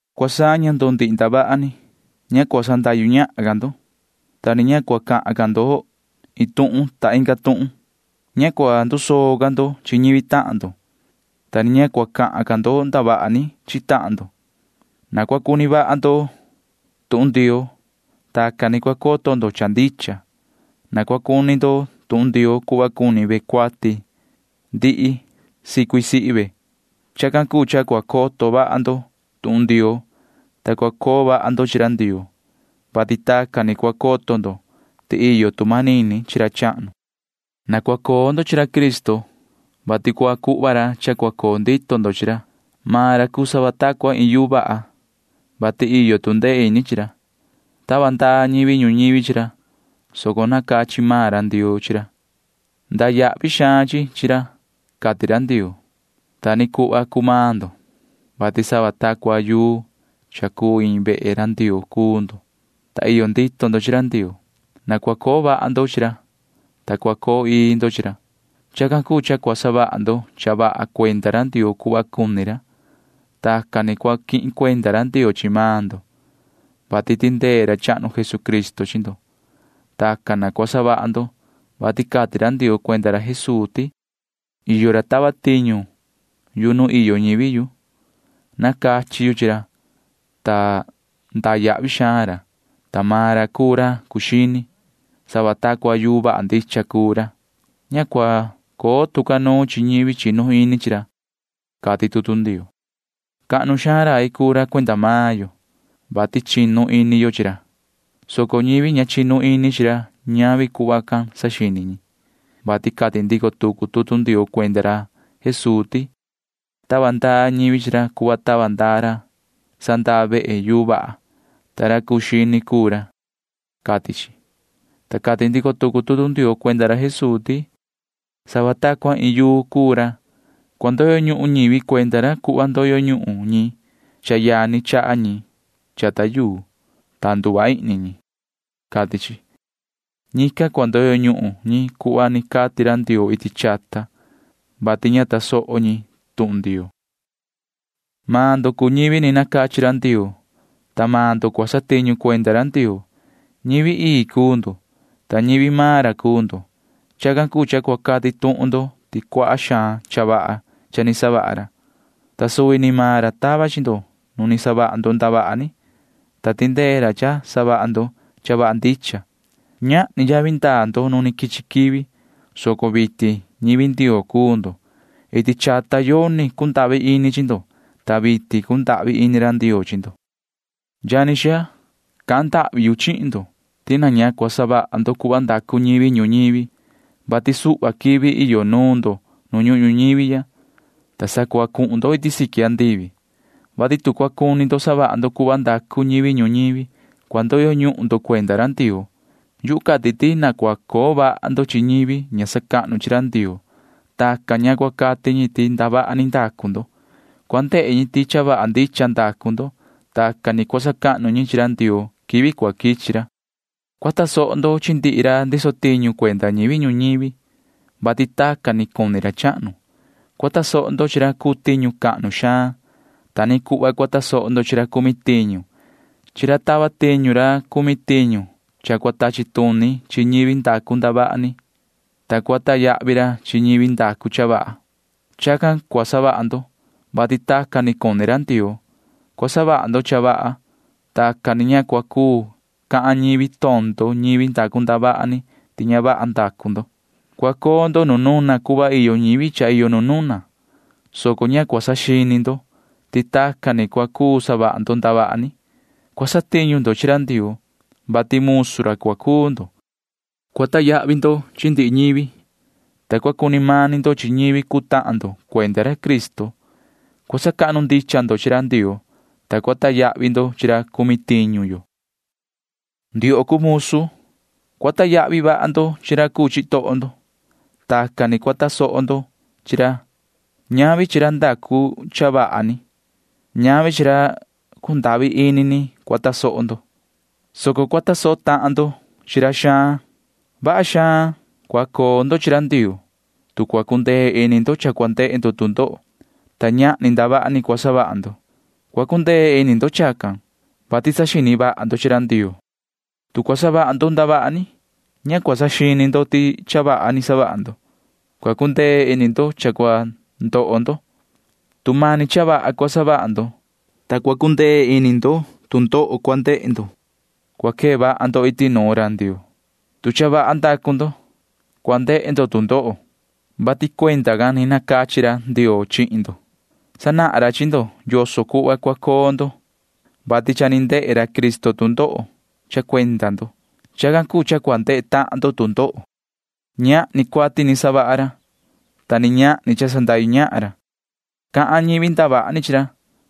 Cua saña ndo ndihi ndavaha ni. Ña cua sandahyu ñahan ca ndo, ta ni ña cua cahan ca ndo iin tuhun inga tuhun. Ña cua ndusoo ca ndo chi ñivi tahan ndo, ta ni ña cua cahan ca ndo ndavaha ni chi tahan ndo. Na cua cuni vaha ndo tuhun Ndioo. Tacan ni cua coto ndo cha ndicha. Na cua cuni ndo tuhun Ndioo cuhva cuni ve cuati ndihli sicui sihi ve. Chacan cuu cha cua coto vaha ndo tuhun Ndioo, ta cua coo vaha ndo chi ra Ndioo, vati tacan ni cua coto ndo ti iyo tu manini chi ra chahnu. Na cua coo ndo chi ra Cristo, vati cua cuhva ra cha cua coo ndito ndo chi ra. Maan ra cuu sava ta cua iin yuu vaha, vati iyo tu ndee ini chi ra. Tava ndaa ñivi ñuñivi chi ra, soco nacachi maan ra Ndioo chi ra. Iyo xaan yavi ndaa chi ra, cati ra Ndioo. Ta ni cuhva cuu maan ndo, vati sava ta cua yuu cha cuu iin vehe Ndioo cuu ndo, ta iyo ndito ndo chi ra Ndioo. Na cua coo vaha ndo chi ra, ta cua coo ii ndo chi ra. Chacan cuu cha cua savaha ndo cha vaha cuenda ra Ndioo cuhva cuni ra. Tacan ni cua quihin cuenda ra Ndioo chi maan ndo, vati tindee ra Jesucristo. Na cua savaha ndo cha tacan, vati cati ra Ndioo cuenda ra Jesuu ti: Iyo ra cha tava tiñu yu nu iyo ñivi yu. Nacachi yu chi ra, ta iyo yavi ndaa ra, ta maan ra cuu ra cuu xini. Sava ta cua yuu vaha ndicha cuu ra. Ña cua coo tu ca nuun chi ñivi chinu ini chi ra, cati tutu Ndioo. Cahnu xaan rai cuu ra cuenda maan yo, vati chinu ini yo chi ra, soco ñavi tacan cuni ñivi ña chinu ini chi ra, vati cati ndico tucu tutu Ndioo cuenda ra Jesuu ti: Tava ndaa ñivi chi ra cuhva tava ndaa ra sandaa vehe chi yuu vaha, ta ra cuu xini cuu ra, cati chi, ta cati ndico tucu tutu Ndioo cuenda ra Jesuu ti: Sava ta cua iin yuu cuu ra. Cua ndoyo ñuhun ñivi cuenda ra cuhva ndoyo ñuhun ñi cha yani chaha ñi chata yuu, ta nduva ihni ñi, cati chi. Ñican cua ndoyo ñuhun ñi cuhva ni cati ra Ndioo iti chata, vati ña tasoho ñi tuhun Ndioo. Maan ndo cuu ñivi ni nacachi ra Ndioo, ta maan ndo cua satiñu cuenda ra Ndioo. Ñivi ii cuu ndo, ta ñivi maan ra cuu ndo. Chacan cuu cha cua cati tuhun ndo ti cuaha xaan cha vaha cha ni savaha ra, ta suvi ni maan ra tava chi ndo nu ni savaha ndo ndavaha ni, ta tindee ra cha savaha ndo cha vaha ndicha. Ñahni yavi ndaa ndo nu quichi quivi, soco vitin ñivi Ndioo cuu ndo. Iti chata yoni cundahvi ini chi ndo, ta vitin cundahvi ini ra Ndioo chi ndo. Yani xaa, cahan ndahvi yu chihin ndo ti na ña cua savaha ndo cuhva cuni savaha ñivi ñuñivi, vati suhva quivi iyo nuun ndo nu ñuhun ñuñivi ya, ta sa cua cuhun ndo iti siqui andivi. Chacan ni tu cua cuni ndo savaha ndo cuhva savaha ñivi ñuñivi, cua ndoyo ñuhun ndo chi ra Ndioo. Yuhu cati ti na cua coo vaha ndo chi ñivi ña sacahnu chi ra Ndioo. Chacan cuu cha tu cua cati ñi ti ndacu ndo ndavaha ni, cua ndehe ñi ti cha vaha ndicha ndacu ndo. Tacan ni cua sacahnu ñi chi ra Ndioo quivi cua quichi ra. Cua tasoho ndo chi ndihi ra ndiso tiñu cuenda ñivi ñuñivi, vati tacan ni cuni ra chahnu. Cua tasoho ndo chi ra cuu tiñu cahnu xaan. Ta ni cuhva cua tasoho ndo chi ra tachi ra cumi tiñu can. Chaha ra tiñu chi ra, vati cua tachi tuni ra chi ñivi ndacu ndavaha ni, ta cua sacahnu ra chi ñivi ndacu cha vaha. Chacan cua savaha ndo, vati tacan ni cuni ra Ndioo. Cua savaha ndo cha vaha. Tacan ni ña cua cuu cahan ñivi tondo ñivi ndacu ndavaha ni ti ña vaha ndacu ndo. Cua coo ndo nu nuna cuhva iyo ñivi cha iyo nu nuna, soco ña cua saxini ndo ti tacan ni cua cuu savaha ndo ndavaha ni. Cua satiñu ndo chi ra Ndioo, vati musu ra cua cuu ndo. Cua sacahnu ndo chi ndihi ñivi, ta cua cuni mani ndo chi ñivi cuu tahan ndo cuenda ra Cristo. Cua sacahnu ndicha ndo chi ra Ndioo, ta cua sacahnu ndo chi ra cumi tiñu yo. Ndioho cuu musu, cua sacahnu vaha ndo chi ra cuu chitoho ndo. Tacan ni cua tasoho ndo chi ra. Ñavi chi ra vaha ni, ñavi chi ra cundahvi ini ni cua tasoho ndo, soco cua tasoho tahan ndo chi ra xaan. Vaha xaan cua coo ndo chi ra Ndioo, tu cua cundee ini ndo cha cua ndehe ndo tu ndoho, ta ñahni ndavaha ni ni savaha maan ndo. Cua cundee ini ndo chacan, vati saxini vaha ndo chi ra Ndioo. Tu cua savaha ndo ndavaha ni, ña cua saxini ndo ti cha vaha ni savaha ndo―masi cua cundee ini ndo cha cua ndoho ndo. Tu mani cha vaha cua savaha ndo, ta cua cundee ini ndo tu ndoho cua ndehe ndo cuenda cha vaha ni savaha ndo, vaha xaan cua cuni ra Ndioo. Cua savaha ndo cha vaha, ta cua ndehe ndo tu ndoho, vati chacan ni nacachi ra Ndioo chihin ndo. Sanahan ra chi ndo yoso cuhva cua coo ndo, vati cha ni ndehe ra Cristo tu ndoho cha cuenda ndo. Chacan cuu cha cua ndehe tahan ndo tu ndoho. Ñahni cuati savaha ra, ta ni ñahni cha sandahyu ñahan ra. Cahan ñivi ndavaha ni chi ra,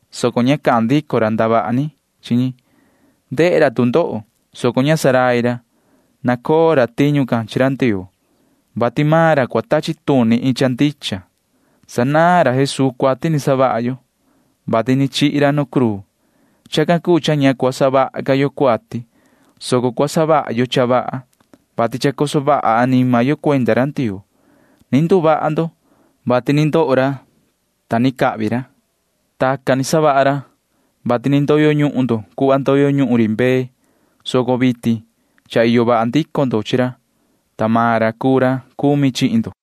soco ña cahan ndico ra ndavaha ni chi ñi. Ndehe ra tu ndoho, soco ña ndurai ra. Nacoo ra tiñu can chi ra Ndioo, vati maan ra cua tachi tuni iin cha ndicha. Sanaan ra Jesuu cuati ni savaha yo, vati ni chihi maan ra nu cruu. Chacan cuu cha ña cua savaha ca yo cuati, soco cua savaha yo cha vaha, vati chacoso vaha anima yo cuenda ra Ndioo. Ni nduvaha maan ndo, vati ndoho maan ra. Tacan ni savaha ra, vati cha ni ndoyo ñuhun ndo cuhva ndoyo ñuhun ri mbee, soco vitin cha iyo vaha ndico ndo chi ra, ta maan ra cuu ra cumi chihin ndo.